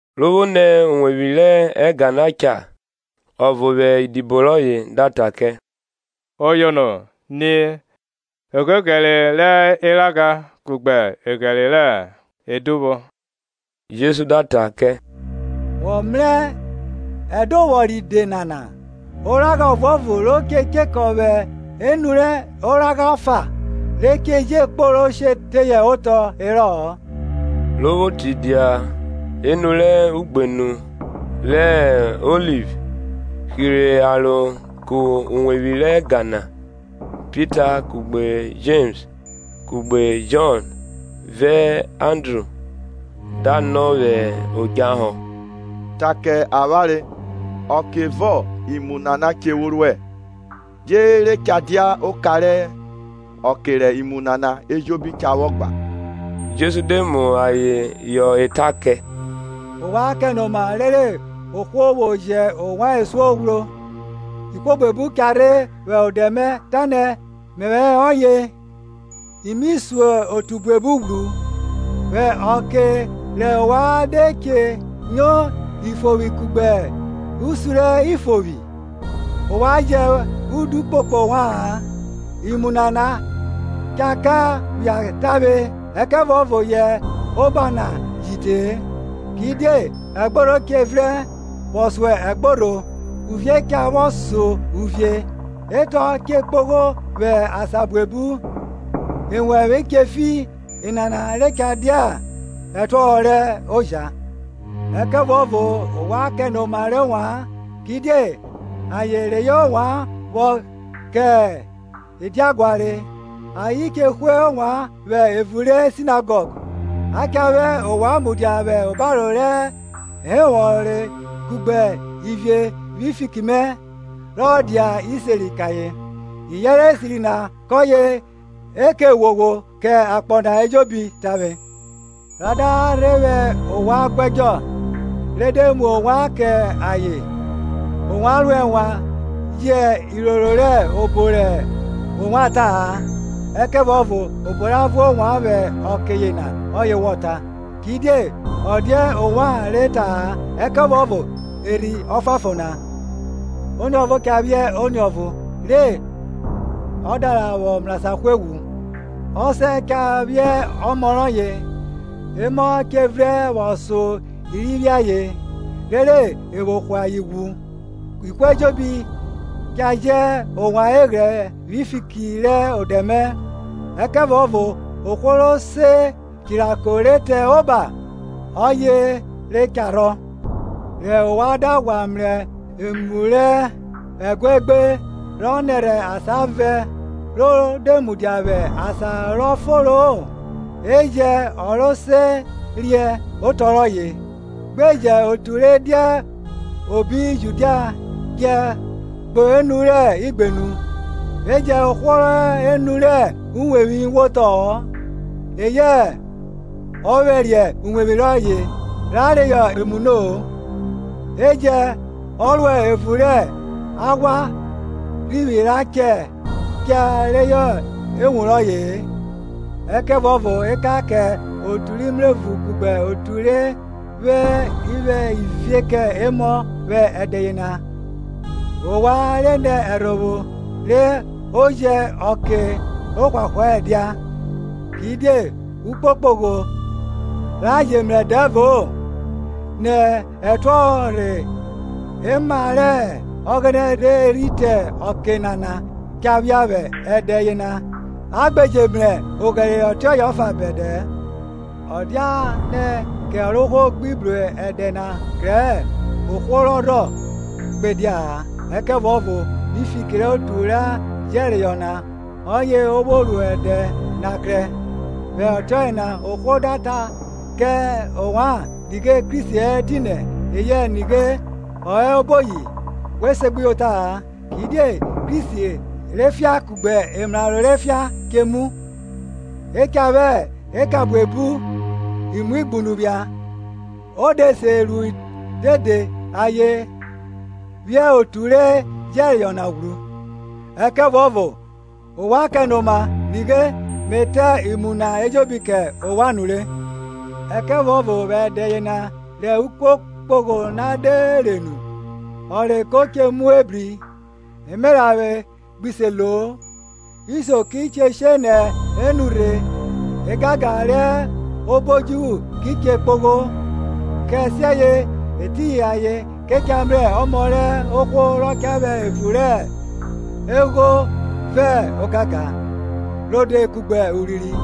Ro vwo nẹ uwevwi rẹ ẹga na cha ọvo vwẹ idibo rọye da ta kẹ, Oyono, ni, egheghẹre rẹ eragha kugbe eghẹre re ẹdovwọ! Jesu da ta kẹ, Wọ mrẹ ẹdovwọ ride nana? Oragha ọvuọvo ro che chekọ vwẹ enu rẹ oragha ọfa, re che je kporo she teye otọ herọ-ọ. Ro vwo tidia enu rẹ ugbenu rẹ Oliv hirhe aro ku uwevwi rẹ ẹga na, Pita, kugbe Jems kugbe Jọn vẹ Andru da nọ vwẹ odjahọ, Ta kẹ avwanre ọke ọvo imu nana che vwo ruẹ? die re cha dia oka rẹ ọke rẹ imu nana ejobi cha vwọ gba? Jesu de mu ayen họ eta kẹ, Ovwan kẹnoma rere ohwo vwo jẹ ovwan esuo ghwro. Ihwo buebu cha rhe vwẹ odẹ mẹ, ta nẹ, Mẹvwẹ hẹ ọye, i mi sun otu buebu ghwru. Vwẹ ọke rẹ ovwan de che nyo ifovwi kugbe usi rẹ ifovwi, ovwan jẹ udu kpokpo ovwa-an; imu nana cha ka phia tavwe, ẹkẹvuọvo yẹ oba na ji te-e. Kidie ẹgborho che vrẹn vwọ so ẹgborho uvie cha vwọ so uvie, etọ che kpogho vwẹ asan buebu ewẹvwe che fi enana re cha dia ẹtuọhọ rẹ oja. Ẹkẹvuọvo ovwan kẹnoma rẹ ovwan. kidie ayen reyọ ovwan vwọ kẹ ediaguare, ayen che hwe ovwan vwẹ evun ri sinagọg; a cha vwẹ ovwan mudia vwẹ obaro rẹ ehọnvwọre kugbe ivie vwi fiki mẹ, re ọ dia iseri kẹ ayen. Iyẹnrẹ esiri na kọye e ke ghwoghwo kẹ akpọ na ejobi tavwe. Ra da rhe vwẹ ovwan guẹdjọ, re de mu ovwan kẹ ayen, ovwan ro ẹnwan jẹ iroro rẹ obo rẹ ovwan ta-a; ẹkẹvuọvo obo ra vuẹ ovwan vwẹ ọke yena ọye wọ ta; kidie ọ dia ovwan re ta-a ẹkẹvuọvo Erhi Ọfuanfon na. Oniọvo cha vwẹ oniọvo re odọvwe ra vwọ mrasan hwe ghwu, ọsẹ cha vwẹ ọmọ re ọdọvwe; emọ che vrẹn vwọ so i ri vwiẹ ayen, rere evwo hwe ayen ghwu. Ihwo ejobi cha jẹ ovwan eghrẹ vwi fiki rẹ odẹ mẹ; ẹkẹvuọvo ohwo ro se chirako ri te oba, ọye re cha rhọ. Re ovwan da ghwa mrẹ emu rẹ ẹguaegbe rọ nẹrhẹ asan vẹn ro mudia vwẹ asan rọ foro-o je jẹn ọ ro se riẹn otọ rọye, gbe jẹn otu re dia obi Judia djẹ kpo enu rẹ igbenu; e jẹn ohwo rọ hẹ enu rẹ uwevwi wotọ-ọ, eyẹ ọ vwẹriẹ uwevwi rọye, ra reyọ emu no-o; e jẹn ọ rọ hẹ evun rẹ aghwa rhivwi cha cha reyọ ewun rọye-e. Ẹkẹvuọvo ekan kẹ otu re mrevun kugbe otu re vwẹ ivie kẹ emọ vwẹ ẹdẹ yena! Ovwan nẹ ẹrhovwo re o jẹ ọke ohwahwa ẹdia. kidie ukpokpogho ra je mrẹ dẹvo-o nẹ ẹtuọhọ rẹ ẹma rẹ Ọghẹnẹ rhe rhi te ọke nana cha phia vwẹ ẹdẹ yena, a gbe je mrẹ oghẹre ọtiọye ọfa bẹdẹ-ẹ. Ọ dianẹ kẹ Ọrovwohwo gbi bru ẹdẹ na krẹ-ẹ, ohwo rọ rhọ gbe dia-a; ẹkẹvuọvo vwi fiki rẹ otu ra jẹreyọ na, ọye o vwo ru ẹdẹ na krẹ. Vwẹ ọtiọye na ohwo da ta kẹ ovwan, Nighe Kristi hẹ etinẹ, eyẹ, Nighe, Ọ hẹ oboyi, we segbuyota-a; Kidie Kristi rẹ efian kugbe emraro rẹ efian che mu, e cha vwẹ eka kugbe imuighunu phia, o de se ru dede ayen phiẹn otu ra jẹreyọ na ghwru. Ẹkẹvuọvo ovwan kẹnoma; nighe Me ta imu na ejobi kẹ ovwan nure. Ẹkẹvuọvo vwẹ ẹdẹ yena, rẹ ukpokpogho na de re nu, ọnre ko che mu ebri, emeranvwe gbi se lo-o. Isio ki che she nẹ enu rhe egangan re he obo odjuvwu ki che kpogho. Kẹsiẹye etiyin ayen ke cha mrẹ Ọmọ rẹ ohwo rọ cha vwẹ evun rẹ egho vẹ ogangan rode kugbe urinrin.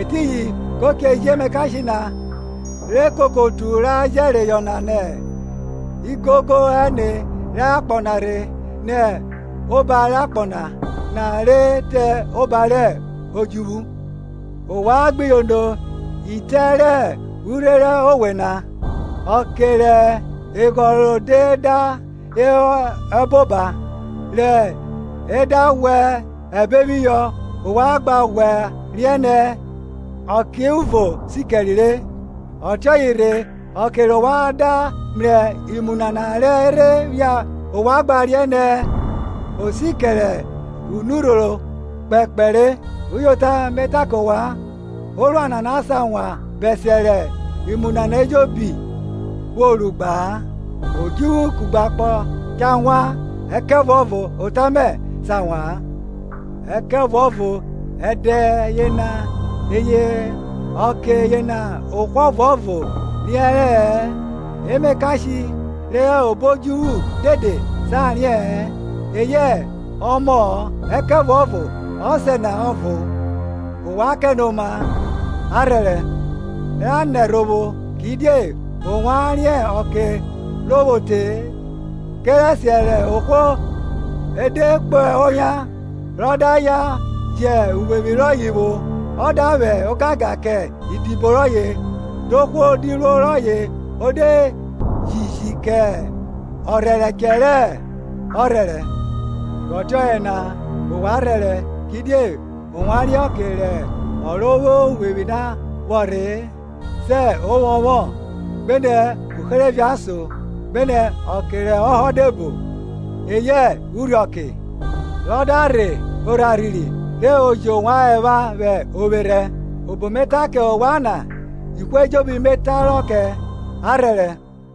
Etiyin ko che ji emakashe na, re koko otu ra jẹreyọ na nẹ igogo ẹne rẹ akpọ na rhe nẹ oba rẹ akpọ na re rẹ oba rẹ odjuvwu. Ovwan gbe yono itẹ rẹ urhe rẹ owe na; ọkẹ rẹ eghọn rọye da hẹ eboba, re e da ghwẹ ẹbe phihọ ovwan gba ghwa riẹn nẹ ọkeuvo sikẹre re. Ọtiọye rhe, ọke rẹ ovwan da mrẹ imu nana re rhe phia ovwan gba riẹn nẹ o sikẹre unurhoro kpekpe re. Uyota Me ta kẹ ovwan, orua nana sa wan bẹsiẹ rẹ imu nana ejobi vwo ru gba-a. Odjuvwu kugbe akpọ cha wan ẹkẹvuọvo ota mẹ sa wa-an. Ẹkẹvuọvo ẹdẹ yena eyẹ ọke yena ohwo ọvuọvo riẹnrẹ-ẹ emakashe re hẹ obo odjuvwu dede sa riẹ-ẹn eyẹ Ọmọ-ọ, ẹkẹvuọvo Ọsẹ na ọvo. Ovwan kẹnoma, a rhẹrẹ ra nẹ ẹrhovwo; kidie ovwan riẹn ọke ro vwo te-e. Kẹrẹsiẹ rẹ ohwo e de kpo oyan, rọ da yan jẹ uwevwi rọye vwo, ọ da vwẹ ogangan kẹ idibo rọye, dohwo diruo rọye o de jiji kẹ ọrhẹrẹchẹ re ọ rhẹrẹ. Vwẹ ọtiọye na ovwan rhẹrẹ; kidie ovwan riẹn ọke rẹ ọ ro vwo uwevwi na vwo rhe-e, sẹ ovwọnvwọn, gbenẹ uherevie ason, gbenẹ ọke rẹ ọhọ de bo, eyẹ urhiọke; rẹ ọ da rhe orharhiri re o jẹ ovwan ẹvwa vwẹ ovwerhẹ. obo me ta kẹ ovwan na, ihwo ejobi mẹ taro kẹ, A rhẹrẹ.